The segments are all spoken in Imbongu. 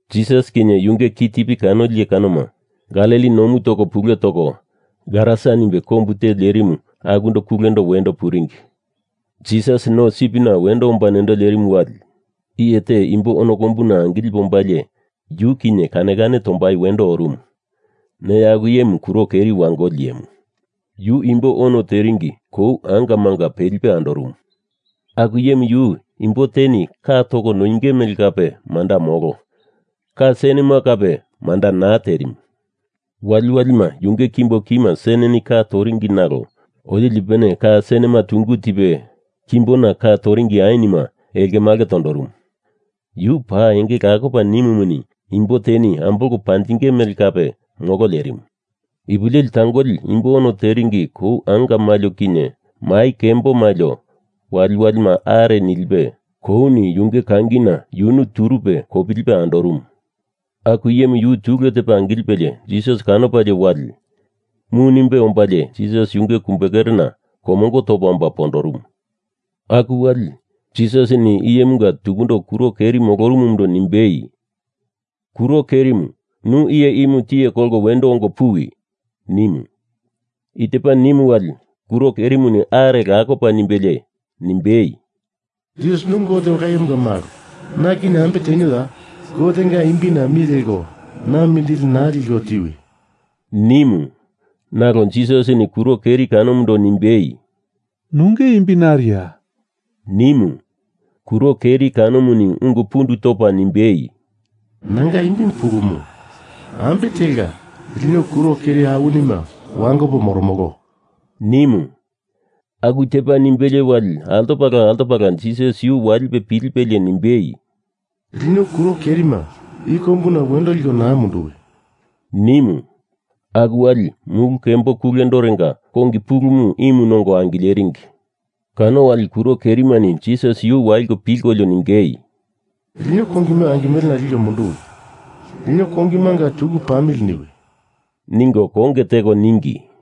Jisas kinye yunge kitipi kanoli iye kanoma Galili nomu toko pule toko Garasa nimbe kombu te lerimu akundo kulendo wendo oringi. Jisas no sipina wendo omba nendo lerimu wali iye te imbo ono kombuna angilipe ombalie yu kinye kane kane tombai wendo orumu. Neya aku iyemu kuro keri wangoli iyemu. Yu imbo ono teringi kou angamanga pelipe andorumu. Aku iyemu yu imbo teni ka toko noinge mele kape manda molo, ka senema kape manda naa terimu. Waliwalima yunge kimbo kima seneni ka toringi nalo otili ipupene ka senema tungu tipe kimbona ka toringi ainima elkemalke tondorumu. Yu paa enge lakopa nimumuni imbo teni ambolko panjinge mele kape molo lerimu. Ipu leli tangoli imbo ono teringi kou anga malio kinye mai kembo malio waliwalima are nilipe kouni yunge kangina yunu turupe kopilipe andorumu. Aku iyemu yu tule tepa angilipe Jisas kanopalie wali, mu nimbe ombalie Jisas yunge kumbekerena komongo topa omba pondorumu. Aku wali, Jisasini iyemunga tukundo kuro keri molorumumundo nimbei, “Kuro kerimu, nu iyemu tiye kolko wendo ongo puwi,” nimu. I tepa nimu wali kuro kerimuni are lakopa nimbelie nimbei, “Jisas nu Gote Ola Iyemunga malo, na kinye ambe tenioya? Gotenga imbina mi leko na mindili naa liko tiwi,” nimu. Nalo Jisasini kuro keri kanomundo nimbei, “Nunge imbi nariya,” nimu. Kuro keri kanomuni ungu pundu topa nimbei, “Nanga imbimu Pulumu, ambe telka lino kuro keri awinima wangopo moromolo,” nimu. Aku tepa nimbelie wali altopala altopala Jisas yu walipe pilipelie nimbei, “Lino kuro kerima i kombuna wendo liko naa munduwi,” nimu. Aku wali mulu kembo kulerenga kongi pulumu imu nongo angileringi. Kano wali kuro kerimani Jisas yu waliko pilkolio ningei, “Lino kongima angimelena liko munduwi. Lino kongimanga tuku pamili niwi,” ningo konge teko ningi.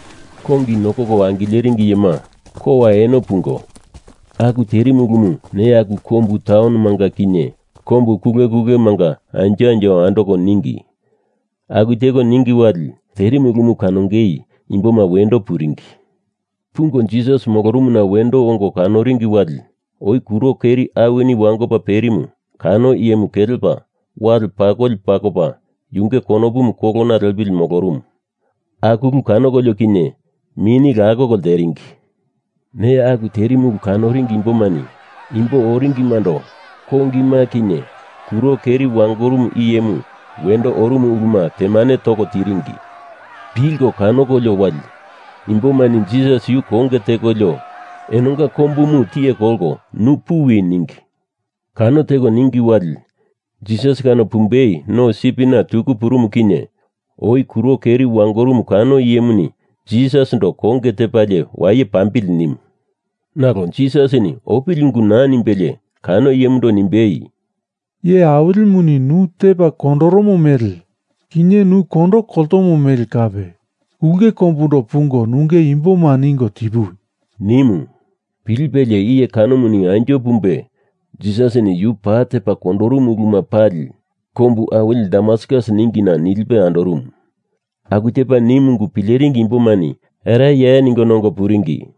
Kongi nokoko angileringi iyema kowa eno pungo aku terimu ulumu neya aku kombu taunomanga kinye kombu kule kulemanga anjo anjo andoko ningi. Aku teko ningi wali, terimu ulumu kanongei imboma wendo puringi. Pungo Jisas molorumuna wendo ongo kanoringi wali oi kuro keri awini wangopa perimu kano iyemu kelepa wale pakoli pakopa yunge konopumu kolona lepili molorumu. Aku ulu kanokolio kinye mini lakoko lteringi. Neya aku terimu ulu kanoringi imbomani imbo oringimando kongima kinye kuro keri wangorumu iyemu wendo orumu uluma temane toko tiringi. Pilko kanokolio wali imbomani Jisas yu konge tekolio enonga kombumu tiye kolko nu puwi, ningi. Kano teko ningi wali, Jisas kano pumbei no sipina tuku purumu kinye, oi kuro keri wangorumu kano iyemuni Jisasindo konge tepalie waye pambili nimu. Nalo Jisasini opili ungu naa nimbelie kano iyemundo nimbei, “Iye Awilimuni nu tepa kondoromo mele kinye nu kondo koltomo mele kape ulke kombundo pungo nunge imboma ningo tipuwi,” nimu. Pilipelie iye kanomu anjo pumbe Jisasini yu paa tepa kondorumu uluma pali kombu awili Dekapolis ningina nilipe andorumu. Aku tepa nimu ungu pileringi imbomani ereye ningo nongo puringi.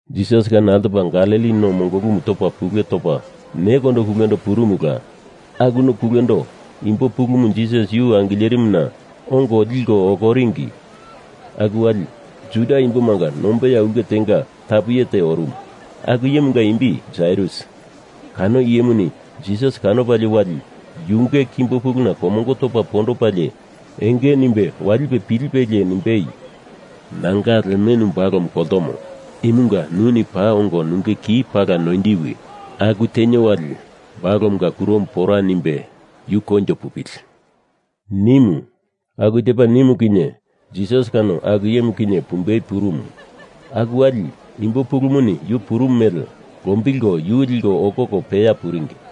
Jisas kano altopala Galili no mongolumu topa pule topa nekondo kulendo purumula. Aku no kulendona imbo pulumu Jisas yu angilerimuna ongo liko okoringi. Aku wali Juda imbomanga nombeya ulke tenga tapu iye te orumu, aku iyemunga imbi Jairus. Kano iyemuni Jisas kanopalie wali yunge kimbo puluna komongo topa pondopalie enge nimbe walipe pilipelie nimbei, “Nanga lemenu balomu koltomo, imunga nuni paa ongo nunge ki pala noindiwi. Aku tenio wali, balomunga kuromu pora nimbe yu koinjo pupili,” nimu. Aku tepa nimu kinye Jisas kano aku iyemu kinye pumbei purumu. Aku wali imbo pulumuni yu purumu mele lombilko yu liko okoko peya puringi.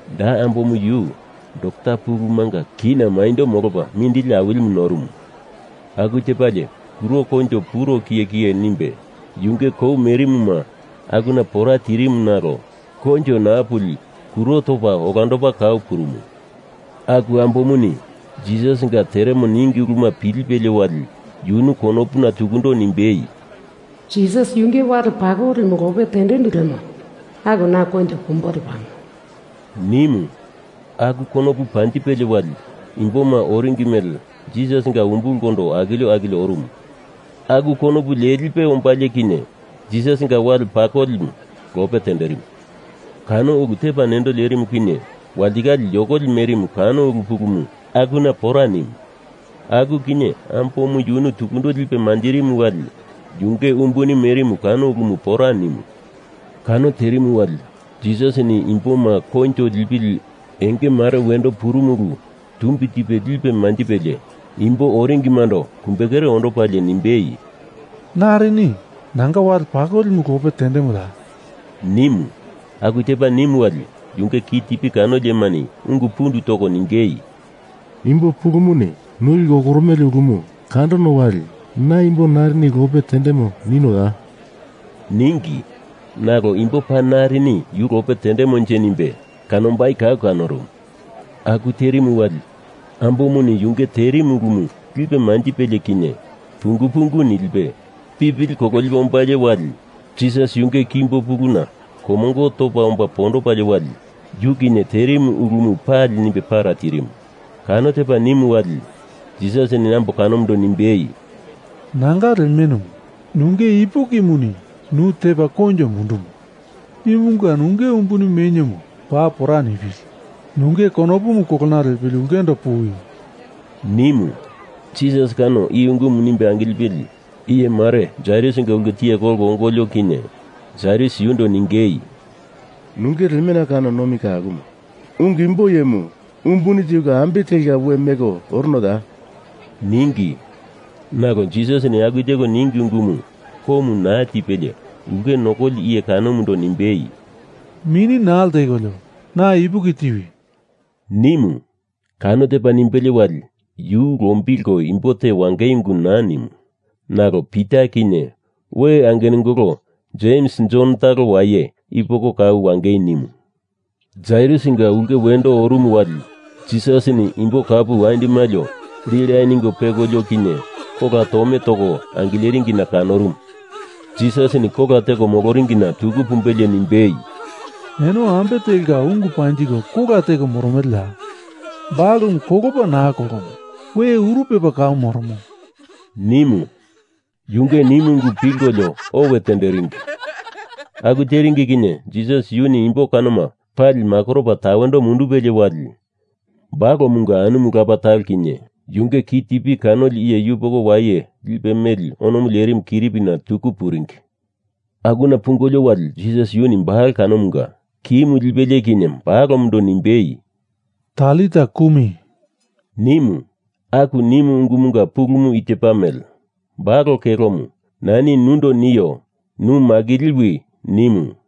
Da ambomu yu dokta pulumunga kina maindo molopa mindili awilimu norumu. Aku tepalie kuro koinjo puro kiyekiye nimbe yunge kou merimuma akuna pora tirimu nalo koinjo naa puli kuro topa olandopa kau purumu. Aku ambomuni Jisasinga teremo ningi uluma pilipelie wali yunu konopuna tukundo nimbei, “Jisas yunge wali pakolimu lope tendendu lemo, aku na koinjo pumbo lepamo,” nimu. Aku konopu panjipelie wali imboma oringi mele Jisasinga umbulkondo akilio akilio orumu. Aku konopu lelipe ombalie kinye Jisasinga wale pakolimu lope tenderimu. Kano ulu tepa nendo lerimu kinye walitikale yokoli merimu kano ulu pulumu akuna pora nimu. Aku kinye ambomu yunu tukundo lipe manjirimu wali yunge umbuni merimu kano ulumu pora nimu. Kano terimu wali Jisasini imboma koinjo lipili enge mare wendo purumu ulu tumbi tipe lipe manjipelie imbo oringimando kumbekere ondopalie nimbei, “Narini nanga wale pakolimu lope tendemoya?” nimu. Aku tepa nimu wali yunge kitipi kanoli iyemani ungu pundu toko ningei, “Imbo pulumuni nu liko okoromele ulu kandono wali na imbo narini lope tendemo ninoya?” ningi. Nalo imbo paa narini yu lope tendemonje nimbe kanombai kau kanorumu. Aku terimu wali ambomuni yunge terimu ulumu lipe manjipelie kinye pungu pungu nilipe pipili kololipe ombalie wali Jisas yunge kimbo puluna komongo topa omba pondopalie wali yu kinye terimu ulumu pali nimbe para tirimu. Kano tepa nimu wali, Jisasini ambo kanomundo nimbei, “Nanga lemenu, nunge ipukimuni nu tepa koinjo mundumo. Imunga nunge umbuni meniomu paa pora nipili, nunge konopumu kolona lepili ulkendo puwi,” nimu. Jisas kano i ungumu nimbe angilipili iyemare Jairusinga ulke tiye kolko ongolio kinye Jairus yundo ningei, “Nunge lemena kano nomi ka akumo. Ungu imbo iyemu umbuni tiko ambe telka we meko oronoya?” ningi. Nalo Jisasini aku teko ningi ungumu komu naa tipelie ulke nokoli iye kanomundo nimbei, “Mini naa ltekolio, na ipuki tiwi,” nimu. Kano tepa nimbelie wali yu lombilko imbo te wangei ungu naa nimu. Nalo Pita kinye we angenungolo Jems Jon talo waye i poko kau wangei nimu. Jairusinga ulke wendo oringi wali Jisasini imbo kapu andi malio lila ningo pekolio kinye kola tome toko angileringina kanorumu. Jisasini kola teko moloringina tuku pumbelie nimbei, “Eno ambe telka ungu panjiko kola teko moromeleya? Balomu kolopa naa kolomo. We uru pepa kau moromo,” nimu. Yunge nimu ungu pilkolio owe tenderingi. Aku teringi kinye Jisas yuni imbo kanoma pali makoropa tawendo mundupelie wali balomunga anumu lapa talo kinye yunge kitipi kanoli iye yupoko waye lipe meli onomu lerimu kiripina tuku puringi. Akuna pungolio wali Jisas yuni balo kanomunga kimu lipelie kinye balomundo nimbei, “Talita kumi,” nimu. Aku nimu ungumunga pulumu i tepa mele, “Balo kelomu, nani nundo nio, nu makiliwi,” nimu.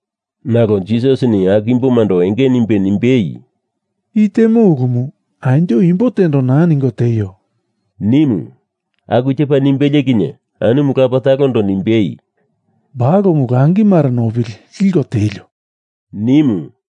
Nalo Jisasini aku imbomando enge nimbe nimbei, “I temo ulumu anjo imbo tendo naa ningo tieio,” nimu. Aku tepa nimbelie kinye anumu lapa talondo nimbei, “Balomu langi mare nopili liko tielio,” nimu.